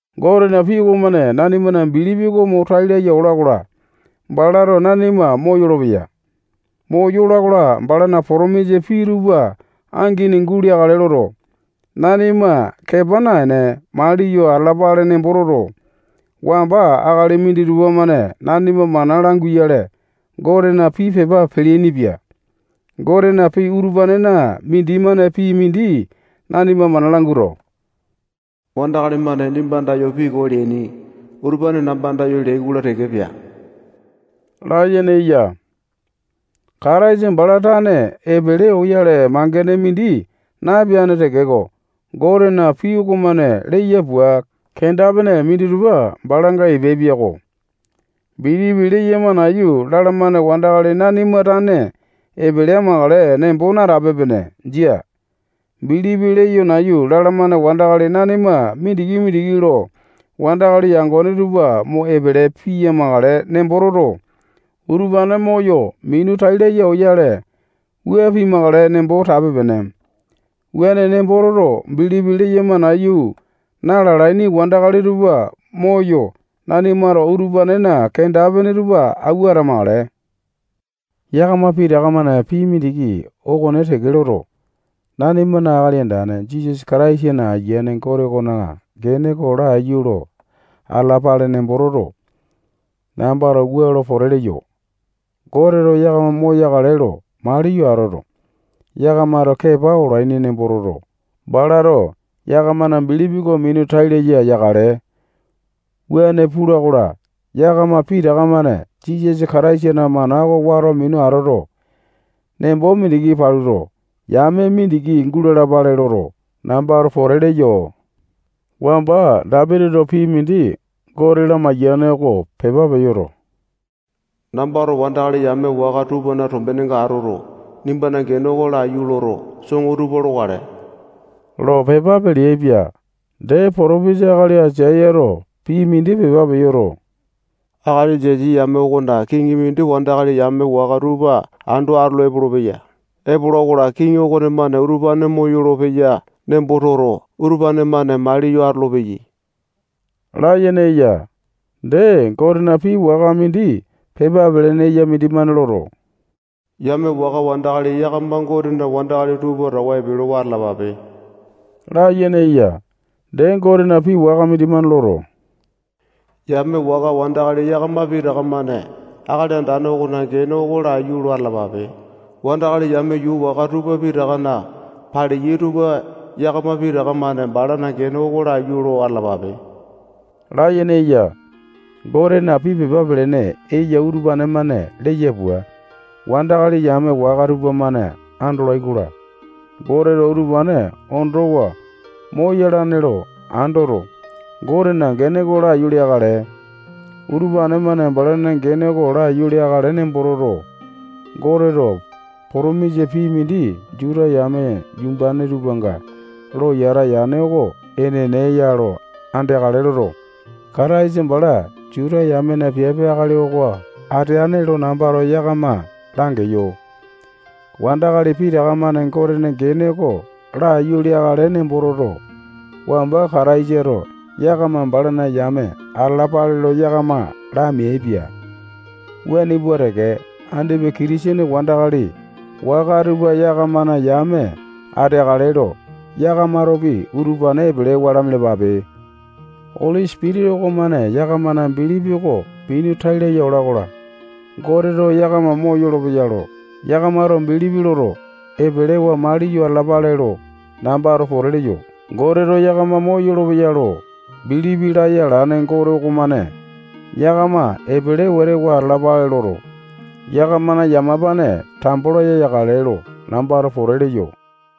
Gotena pii okomane nanimana bilipi oko mo tai laya ola-kola, balato nanima moyolo-peya. Moyola-kola, balana potomisa pii tupa angini guleakale loto, nanima kepa naene, maliyo atalapale nembo toto, wamba akali minditupa-mane nanima mana languyale Gotena pii pepa peleaini-pia. Gotena pii utupanena mindimane pii mindi nanima mana languato, wandakali-mane nimba andayo pii koo leaini utupane namba andayo leai-kola, pea layene eya. Kataisa bala tane epele oyale mangene mindi napeane tekeko, Gotena pii okonemane leya pua, kenda-pene minditupa balanga epeai-piako. Bilipi leyama nayu lalamane wandakali nanima tane epele amakale nembo natape-pene. Jia. Bilipi leyo nayu lalamane wandakali nanima mindiki-mindiki lo wandakali yangone tupa mo epele piyamakale nembo toto, utupane moyo minu tai laya oyale, wua pimakale nembo tape-pene. Wuane nembo toto, bilipi leyama nayu na-lalaini wandakali tupa moyo, nanimato utupanena kenda-pene tupa awua atamakale. Yakama pitaka-mane pii mindiki okone teke loto, nanimana Akali Andane Jisasa Kataisana Aiyane Gote okona gene oko laiyu lo atalapale nembo toto, nambato wua lo pote leyo: Goteto yakama moyakale lo maliyo atoto, yakamato kepa olaini nembo toto, balato yakamana bilipi oko minu tai laya yakale. Wuane pula-kola, yakama pitaka-mane Jisasa Kataisana mana oko wato minu atoto, nembo mindiki paluto, yame mindiki gulalapale loto, nambato pote leyo. Wamba Dapitito pii mindi Gote lamaiyane oko pepa peyoto, nambato wandakali yame waka tupana tombenenga atoto, nimbana gene oko laiyu loto, soŋo tupa lokale lo pepa peleaipia. Dee, potopisa akali Aisayato pii mindi pepa peyoto, akali Jesi yame okona kiŋi mindi wandakali yame waka tupa ando atolo epolopeya. Epola-kola, kiŋi okonemane utupane moyolo-peya nembo toto, utupane-mane maliyo atolopeyai layene eya. Dee, Gotena pii waka mindi pepa pelene eya mindimane loto, yame waka wandakali yakama Gotena wandakali tupa towa epelewa atalapape layene eya. Dee, Gotena pii waka mindimane loto, yame waka wandakali yakama pitaka-mane Akali Andane okona gene oko laiyu lo atalapape. Wandakali yame yuu waka tupa pitakana paleyai tupa yakama pitaka-mane balana gene oko laiyu lo atalapape layene eya. Gotena pii pepa pelene eya utupane-mane leya pua, wandakali yame waka tupamane andolai-kola, Goteto utupane ondowa moyalane lo andoto, Gotena gene oko laiyu leakale. Utupane-mane balana gene oko laiyu leakale nembo toto, Goteto potomisa pii mindi Juta yame yumbane tupanga lo yata yane oko enene ya lo andeakale loto, Kataisa bala Juta yamena piape akali oko ateane lo nambato yakama langeyo. Wandakali pitaka-mane Gotena gene oko laiyu leakale nembo toto, wamba Kataisato yakama balana yame atalapale lo yakama lameaipia. Wuane pua teke, andipa Kitisene wandakali waka tupa yakamana yame ateakale lo yakamatopi utupane epelewa lamialapape. Oli Sipitisa okomane yakamana bilipi oko minu tai laya ola-kola, Goteto yakama moyolo-peya lo yakamato bilipi loto, epelewa maliyo atalapale lo nambato pote leyo. Goteto yakama moyolo-peya lo bilipi laya alane Gote okomane yakama epele wete wa atalapale loto, yakamana yamapane tambo laya yakale lo, nambato pote leyo.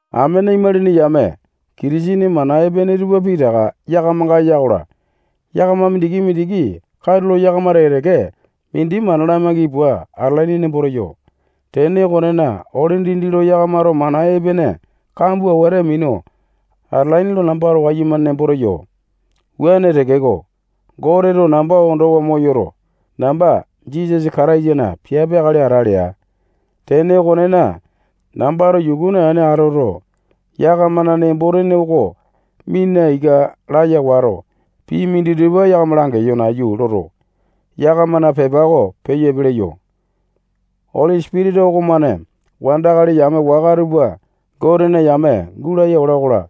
Amene imalini yame, Kitisene mana epene tupa pitaka yakamanga eya-kola, yakama mindiki-mindiki katulo yakama teke-teke mindi mana lamaiki pua atalaini nembo teyo. Tene okonena, ole dindi lo yakamato mana epene kambua wete minu atalaini lo nambato wayumane nemboto teyo. Wuane tekeko, Goteto namba ondowa moyoto, namba Jisasa Kataisana piape akali ata lea. Tene okonena, nambato yuku naene atoto, yakamana nembo-tene oko mina ika laya wato, pii minditupa yakama langeyo nayu loto, yakamana pepa oko peyo epe leyo. Oli Sipitisa okomane wandakali yame waka tupa Gotena yame gulaya ola-kola,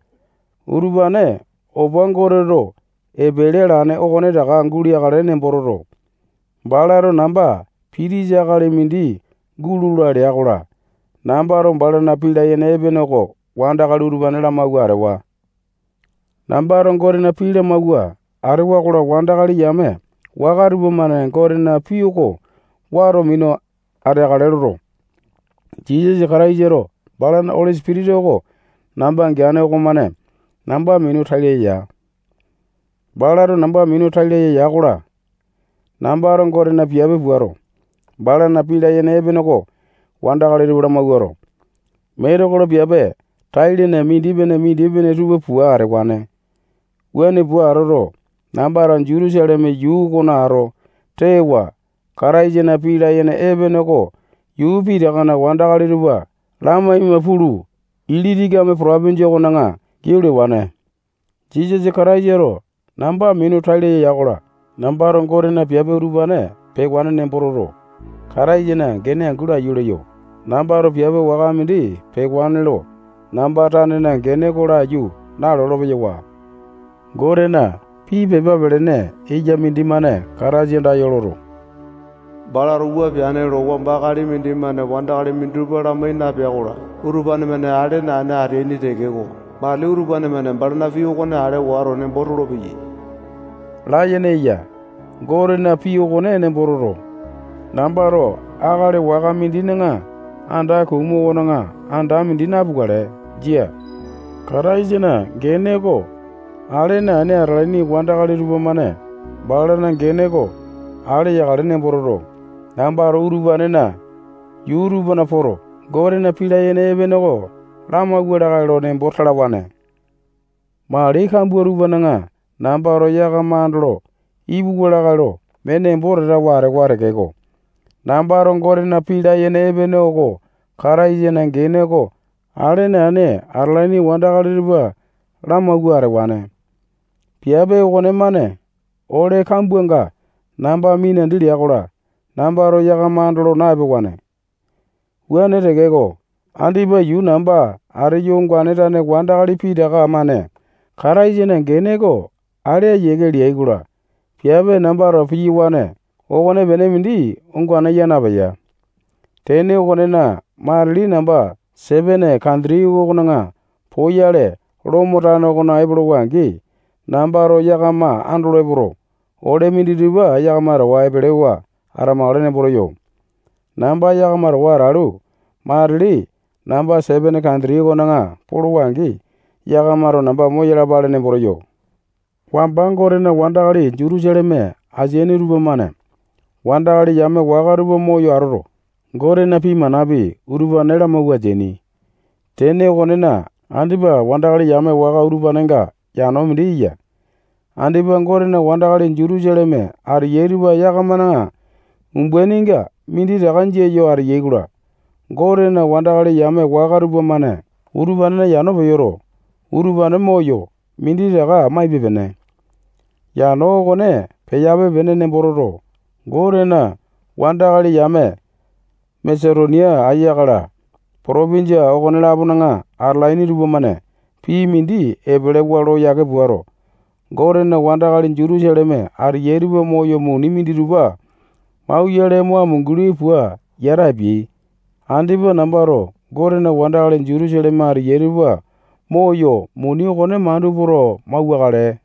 utupane opa Goteto epele alane okonetaka guleakale nembo, balato namba pitisa akali mindi gulola lea-kola, nambato balana pii layene epene oko wandakali utupane lamauwa atewa. Nambato Gotena pii lamawua atewa-kola, wandakali yame waka tupamane Gotena pii oko wato minu ateakale loto, Jisasa Kataisato balana Oli Sipitisa oko namba geane okomane namba minu tai laya ya. Balato namba minu tai laya ya-kola, nambato Gotena piape puato, balana pii layene epene oko wandakali tupa lamawuato, metekolo piape tai-lene mindipene-mindipene tupa pua atewane. Wuane pua atoto, nambato Jutusaleme yuu okona ato tewa Kataisana pii layene epene oko yuu pitakana wandakali tupa lamaima pulu, Ilitikame potopinjia okona giau lewane. Jisasa Kataisato namba minu tai laya ya-kola, nambato Gotena piape utupane peane nembo toto, nambato Kataisana gene angu laiyu leyo. Nambato, piape waka mindi pewane lo namba tanena gene oko nalolo-peyowa. Gotena pii pepa pelene eya mindimane Kataisa andayo loto, balato wua peane lo wamba akali mindimane wandakali minditupa lamai napea-kola, utupane-mane ale naene ateaini tekeko, matili utupane-mane balana pii okone ale wato, nembo tolopeyai layene eya. Gotena pii okone nembo toto, nambato akali waka mindina anda kumu okona anda mindi napukale. Jia. Kataisana gene oko ale naene atalaini wandakali tupamane balana gene oko ale yakale nembo toto, nambato utupanena yuu tupana poto, Gotena pii layene epene oko lamauwa lakae lo nembo talawane. Mali kambua tupana nambato yakama andolo ipuwa lakae lo mee nemboto atewa tekeko, nambato Gotena pii layene epene oko Kataisana gene oko ale naene atalaini wandakali tupa lamauwa atewane. Piape okonemane ole kambuanga namba minandi lea-kola, nambato yakama andolo na-epewane. Wuane tekeko, andipa yuu namba ateyo ongane tane wandakali pitaka-mane Kataisana gene oko ale ayiake leyai-kola, piape nambato piyawane okonepene mindi ongane yaa napeya. Tene okonena, matili namba Sepene kanditi okona poyale, Lomo tano okona epolowa-angi, nambato yakama andolo epoto, ole minditupa yakama towa epelewa atamakale nembo teyo. Namba yakama towa atalu, matili namba Sepene kanditi okona polowa angi, yakamato namba moyalapale nembo teyo. Wamba Gotena wandakali Jutusaleme ateyai tupamane wandakali yame waka tupa moyo atoto, Gotena pii manapi, utupane lamauwa ateaini. Tene okonena, andipa wandakali yame waka utupanenga yano mindi eya. Andipa Gotena wandakali Jutusaleme ateyai tupa yakamana umbaininga minditaka jia yo ateyai-kola, Gotena wandakali yame waka tupamane utupanena yano peyoto, utupane moyo, minditaka maipe-pene. Yano okone peyape-pene nembo toto, Gotena wandakali yame waka Masetonia, Akaya-la, potopinjia okone-lapona atalaini tupamane pii mindi epelewa lo yake puato, Gotena wandakali Jutusaleme ateyai tupa moyo muni minditupa mauyale mo amunguli pua yata apiai. Wuane peai-kola, andipa nambato Gotena wandakali Jutusaleme ateyai tupa moyo, muni okone mandu poto, mauwakale.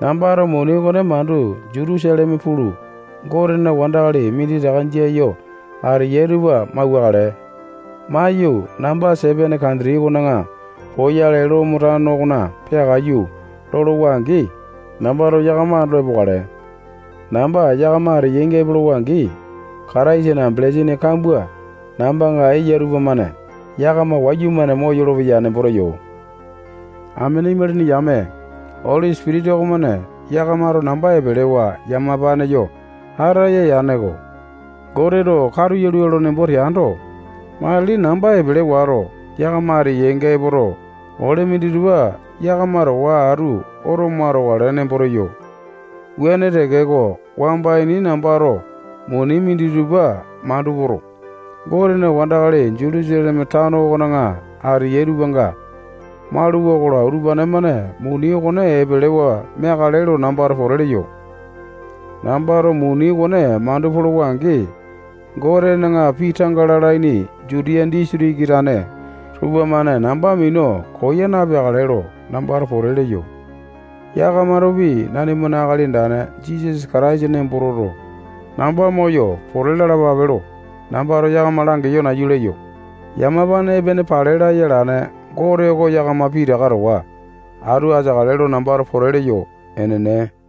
Nambato muni okone mandu Jutusaleme pulu, Gotena wandakali minditaka jia yo ateyai tupa mauwakale. Maiyu, namba Sepene kanditi okona poyale Lomo tano okona peakaiyu lolowa-angi, namba yakama andolo epokale. Namba yakama ateyainga epolowa-angi, Kataisana belesini kambua nambanga eya tupamane yakama wayumane moyolo-peya nembo teyo. Amene imalini yame, Oli Sipitisa okomane yakamato namba epelewa yamapane yo ataya yaneko. Goteto katu yalua lo nembo teando, matili namba epele wato, yakama ateyainga epoto, ole minditupa yakama towa atu oto mo atokale nembo teyo. Wuane tekeko, wamba ini nambato muni minditupa mandu poto, Gotena wandakali Jutusaleme tano okona ateyai tupanga mauluwa-kola, utupane-mane muni okone epelewa meakale lo nambato pote leyo. Nambato muni okone mandu polowa-angi, Gotena pii tanga lalaini Jutiya disitiki tane tupamane namba minu koya napeakale lo nambato pote leyo. Yakamatopi nanimana Akali Andane Jisasa Kataisa nembo toto, namba moyo, pote lalapape lo nambato yakama langeyo nayu leyo. Yamapane epene pale laya alane Gote oko yakama pitaka towa atu ateakale lo nambato pote leyo. Enene.